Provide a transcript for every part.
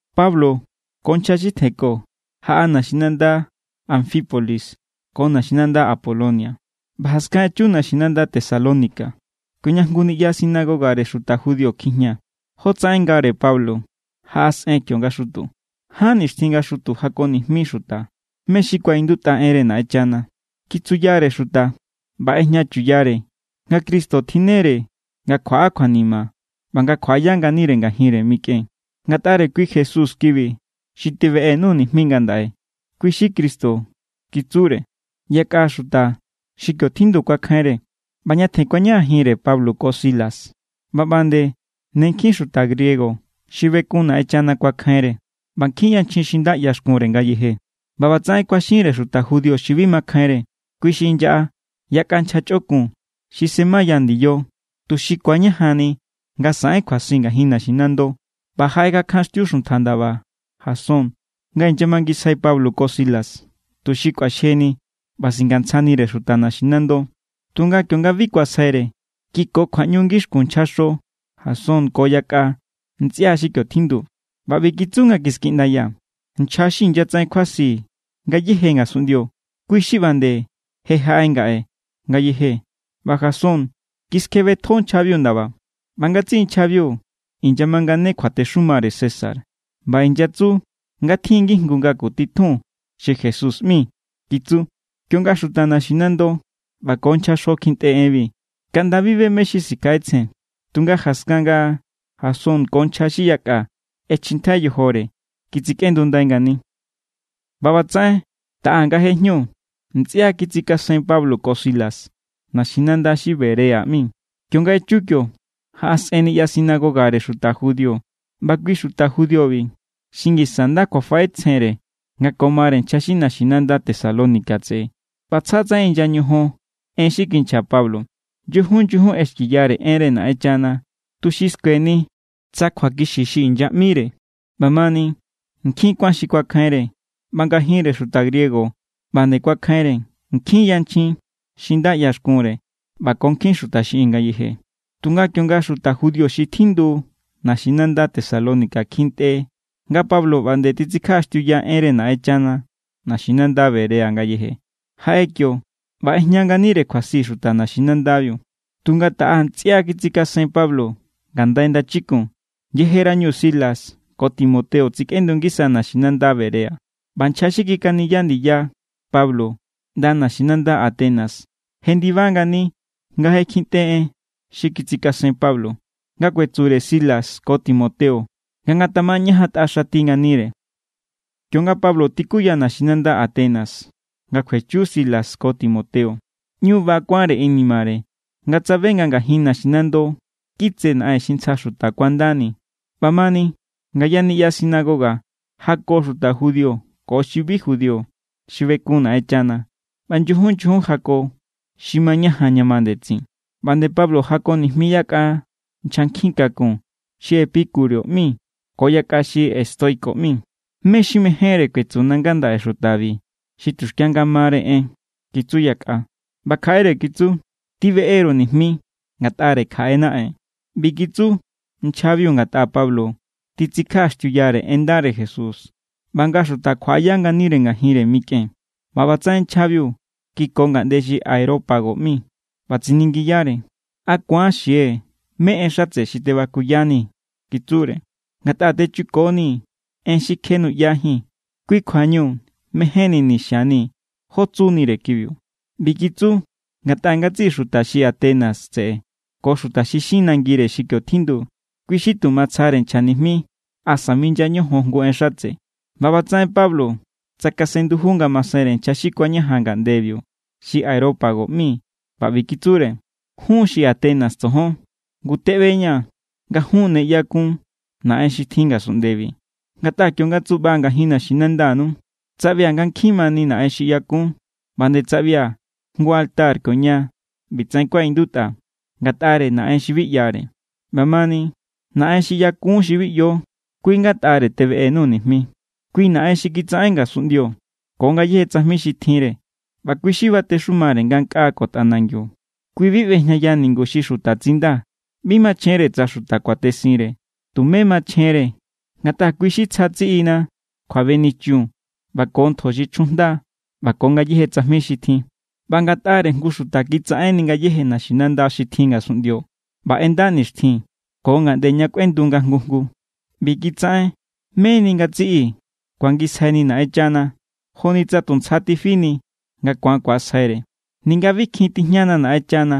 Pablo ko nchja xi tjenko jaꞌa naxinanda Anfípolis ko naxinanda Apolonia, ꞌba jaskan echu naxinanda Tesalónica kioña jngu niꞌya sinagogare xuta judío kjijña. Jotsaꞌen ngare Pablo, jaꞌasꞌen kio nga xutu. Ján nixtjin nga xutu jako nijmi xuta mé= xi kuaꞌindutꞌa enre Naꞌenchana. Kitsuyare xuta ꞌba ꞌejñachuyare nga Cristo tjinnere nga kjuaꞌa kjuanima ꞌba nga kjuaꞌaya nganire ngajinre mikꞌen. —Ngatꞌare kui Jesús kibi xi tebeꞌenuu̱ nijmi ngandaꞌe, kui= xi Cristo —kitsure. Yakꞌa xuta xi kio tjindu kuakjainre ꞌba ñatjen kuañajanjinre Pablo ko Silas. ꞌBa ꞌba nde ne nkjin xuta griego xi bekun Naꞌenchana kuakjainre ꞌba nkjin yanchjin xi nda ꞌyaxkunre ngayeje. ꞌBa ꞌbatsaꞌen kuaxinre xuta judío xi bi makjainre. Kui xi inyaꞌa yakꞌa nchja chꞌokun xi semaya ndiyo, tuxi ku̱añajanni nga saꞌen kjuasi ngajin naxinando. ꞌBa jaꞌekjankjanxtiu xuntja ndaba Jasón nga inyamangisjai Pablo ko Silas, tuxi kꞌuaxjeni ꞌba singantsjanire xuta naxinando. Tunga kionga bi kuasjaire, kiko kjuaꞌñu ngixkun nchjaxo Jasón ko yakꞌa ntsꞌia xi kio tjindu. ꞌBa ꞌbi kitsu nga kiskiꞌndaya: —Nchja xi inyatsaꞌen kjuasi ngayéje ngasunꞌndio, kui= xi ꞌba nde je jaꞌe ngaꞌe ngayeje. ꞌBa Jasón kiskjebetjo nchjabiu ndaba. ꞌBa ngatsiꞌi nchjabiu inyamangane kjuatexumare César ꞌba inyatsu nga tjin ngijngu ngaku titjun xi Jesús ꞌmi —kitsu. Kionga xuta naxinando ꞌba ko nchjaxo kjintꞌe enbi, kaꞌnda bi be mé= xi sikjaꞌetsjen. Tunga jaskan nga Jasón ko nchja xi yakꞌa ꞌechjintjai yojore, kitsikꞌendundai ngani. ꞌBa ꞌbatsaꞌen taꞌa nga je jñu, ntsꞌia kitsikasen Pablo ko Silas naxinanda xi Berea ꞌmi. Kionga echu kio, jaꞌasꞌen niꞌya sinagogare xuta judío. ꞌBa kui xuta judíobi xi ngisa nda kjuafaꞌetsjenre nga ko mare nchja xi naxinanda Tesalónica tseꞌe, ꞌba tsja tsaꞌen inya ñojon en xi kinchja Pablo. Nyujun nyujun ꞌexkiya enre Naꞌenchana tuxi skueni tsa kjuakixi xi inyaꞌmire. ꞌBamani, nkjin kuán xi kuakjainre, ꞌba ngajinre xuta griego ꞌba nde kuakjainre, nkjin yanchjin xi nda ꞌyaxkunre ꞌba ko nkjin xuta xiꞌin ngayeje. Tunga kionga xuta judío xi tjindu naxinanda Tesalónica kjintꞌe nga Pablo ꞌba nde titsikjaꞌaxtiuya enre Naꞌenchana naxinanda Berea ngayeje, jaꞌe kio ꞌba ꞌejña nganire kjuasi xuta naxinandabiu. Tunga taꞌa ntsꞌia kitsikasen Pablo ngandai ndachikun, yejerañu Silas ko Timoteo tsikꞌendu ngisa naxinanda Berea. ꞌBa nchja xi kikaniya ndiya Pablo ꞌnda naxinanda Atenas jendiba ngani nga je kjintꞌe en xi kitsikasen Pablo, nga kuetsure Silas ko Timoteo nga ngatamañajantꞌa xati nganire. Kionga Pablo tikuya naxinanda Atenas nga kjuechu Silas ko Timoteo, ꞌñu ba kuánre inimare nga tsabe nga ngajin naxinando kitse naꞌen xi ntsja xuta kuandani. ꞌBamani, ngaya niꞌya sinagoga jako xuta judío ko xi bi judío xi bekun Naꞌenchana, ꞌba nyujun nyujun jako xi mañajan ña ma ndetsin. ꞌBa nde Pablo jako nijmi yakꞌa nchja nkjin kakun xi epicúreo ꞌmi ko yakꞌa xi estoico ꞌmi. —¿Mé= xi mejénre kuetsuna ngandaꞌe xutabi xi tuxkia nga mare en? —kitsu yakꞌa. ꞌBa kjaꞌere kitsu: —Tibeꞌe=ru nijmi ngatꞌare kjaꞌe naꞌen. ꞌBi kitsu nchjabiu ngatꞌa Pablo titsikjaꞌaxtiuyare en ndare Jesús ꞌba nga xuta kjuaꞌaya nganire ngajinre mikꞌen. ꞌBa ꞌbatsaꞌen nchjabiu kiko ngaꞌnde xi Areópago ꞌmi ꞌba tsiningiyare: —¿A ku̱an xie̱ mé= en xatse xi tebakuyanii̱? —kitsure—. Ngatꞌa techukonii̱ en xi kje nuꞌyajíi̱n. Kui= kjuañu mejénnini̱ xianii̱ jó tsunire kibiu. ꞌBi kitsu ngatꞌa ngatsiꞌi xuta xi Atenas tseꞌe ko xuta xi xin nangire xi kio tjindu, kui xi tu matsjare nchja nijmi asa minya ñojon jngu en xatse. ꞌBa ꞌbatsaꞌen Pablo tsakasen nduju nga masenre nchja xi kuañajan ngaꞌndebiu xi Areópago ꞌmi ꞌba ꞌbi kitsure: —Jun, xi Atenas tsojon, ngu teꞌbeña̱ nga jun ne ꞌñu ꞌyakun naꞌen xi tjin ngasunꞌndebi, ngatꞌa kionga tsuꞌbaa̱ ngajin naxinandanu, tsaꞌbia̱ nga nkjin mani naꞌen xi ꞌyakun. ꞌBa nde tsaꞌbia̱ jngu altar kioña ꞌbitsaꞌen kuaꞌindutꞌa: “Ngatꞌare naꞌen xi bi ꞌyare.” ꞌBamani, Naꞌen xi ꞌyakun xi bi ꞌyo, kui ngatꞌare tebeꞌenuu̱ nijmi. ’Kui Naꞌen xi kitsaꞌen ngasunꞌndio ko ngayéje tsajmi xi tjinre ꞌba kui= xi batexumare ngankꞌaa ko tꞌanangiu. Kui bi ꞌbejñaya ningu xi xuta tsinda. Bi machjenre tsa xuta kuatesinre. Tumé machjenre, ngatꞌa kui= xi tsja tsiꞌina kjuabenichun ꞌba ko ntjo xi chjujnda ꞌba ko ngayéje tsajmi xi tjin. ꞌBa ngatꞌare jngu xuta kitsaꞌenni ngayéje naxinanda xi tjin ngasunꞌndio ꞌba ꞌenda nixtjin ko ngaꞌnde ña kꞌuendu nga jngu jngu. ꞌBi kitsaꞌen meni nga ngatsiꞌi ku̱angisjaini Naꞌenchana, joni tsa tu ntsja tifini nga ku̱an ku̱asjaire, ninga bi kjin tijñana Naꞌenchana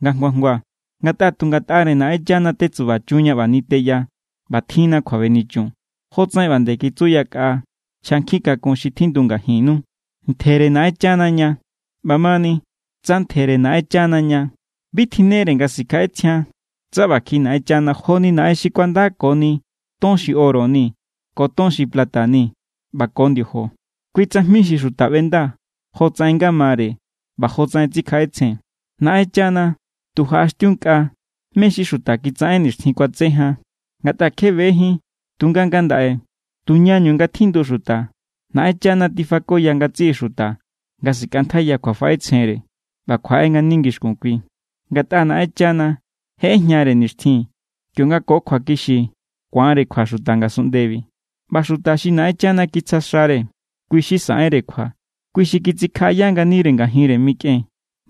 nga jngua jngua. ’Ngatꞌa tu ngatꞌare Naꞌenchana tetsubachunña ꞌba niteya ꞌba tjinna kjuabenichun, jotsaꞌen ꞌba nde kitsu yakꞌa nchja nkjin kakun xi tjindu ngajinnu: “Ntjere Naꞌenchana ña.” ꞌBamani, tsa ntjere Naꞌenchana ña, bi tjinnere nga sikjaꞌetsjian tsa ꞌba kjiꞌi Naꞌenchana joni naꞌen xi kuandakoni ton xi oro ni ko ton xi plata ni ꞌba ko ndiojo. Kui tsajmi xi xuta ꞌbenda jotsaꞌen nga mare ꞌba jotsaꞌen tsikjaꞌetsjen. ’Naꞌenchana tu jaꞌaxtiunkꞌa mé= xi xuta kitsaꞌen nixtjin kuatse jan, ngatꞌa kje bejín. Tunga ngandaꞌe tuñañu nga tjindu xuta, Naꞌenchana tifakoya ngatsiꞌi xuta nga sikꞌantjaiya kjuafaꞌetsjenre ꞌba kjuaꞌe ngani ngixkun Kui. Ngatꞌa Naꞌenchana je ꞌejñare nixtjin kionga ko kjuakixi ku̱anre kjua xuta ngasunꞌndebi. ꞌBa xuta xi Naꞌenchana kitsja xare, kui= xi saꞌenre kjua. Kui= xi kitsikjaꞌaya nganire ngajinre mikꞌen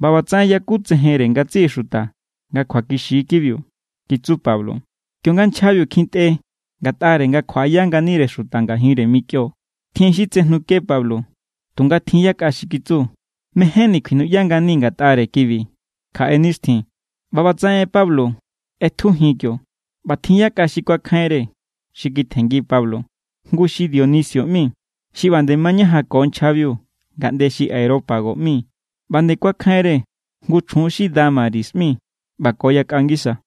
ꞌba ꞌbatsaꞌen yakutsejenre ngatsiꞌi xuta nga kjuakixi= kibiu —kitsu Pablo. Kionga nchjabiu kjintꞌe ngatꞌare nga kjuaꞌaya nganire xuta ngajinre mikꞌion, tjin xi tsejnuke Pablo. Tunga tjin yakꞌa xi kitsu: —Mejénni̱ kuinuꞌya nganii̱ ngatꞌare kibi kjaꞌe nixtjin. ꞌBa ꞌbatsaꞌen Pablo ꞌetjujin kio, ꞌba tjin yakꞌa xi kuakjainre, xi kitjenngi Pablo. Jngu xi Dionisio ꞌmi, xi ꞌba nde mañajanko nchjabiu ngaꞌnde xi Areópago ꞌmi, ꞌba nde kuakjainre jngu chjun xi Dámaris ꞌmi ꞌba ko yakꞌa ngisa.